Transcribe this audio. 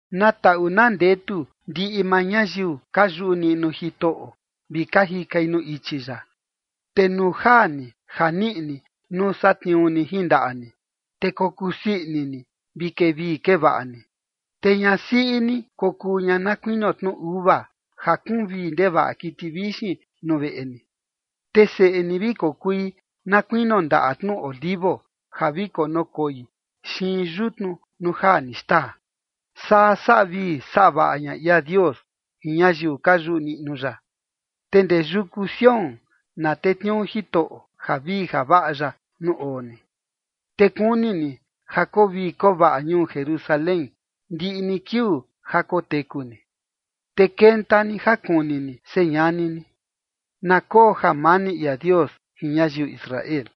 Na taꞌu na ndetu ndiꞌi maa ñayiu ka yuꞌu niꞌnu Jitoꞌo, vi ka jikai nuu ichi ya. Te nuu jaa ni ja niꞌi ni nuu satniuu ni jin ndaꞌa ni, te kokusii ini ni vi kevii kevaꞌa ni. Te ñasiꞌi ni kokuu ña na kuinio tnu uva, ja kuun vii ndevaꞌa kiti vixin nuu veꞌe ni. Te seꞌe ni vi kokui na kuinio ndaꞌa tnu olivo ja vi konukoi xiin yutnu nuu jaa ni xtaa. Saa saꞌa vii saꞌa vaꞌa ña ia Dios jin ñayiu ka yuꞌu niꞌnu ya. Te ndee yuku Sión na tetniuu Jitoꞌo javii javaꞌa ya nuu oo ni, te kuni ni ja koo vii koo vaꞌa ñuu Jerusalén, ndiꞌi ni kiuu ja koteku ni. Te kenta ni ja kuni ni señani ni. ¡Na koo jamani ia Dios jin ñayiu Israel!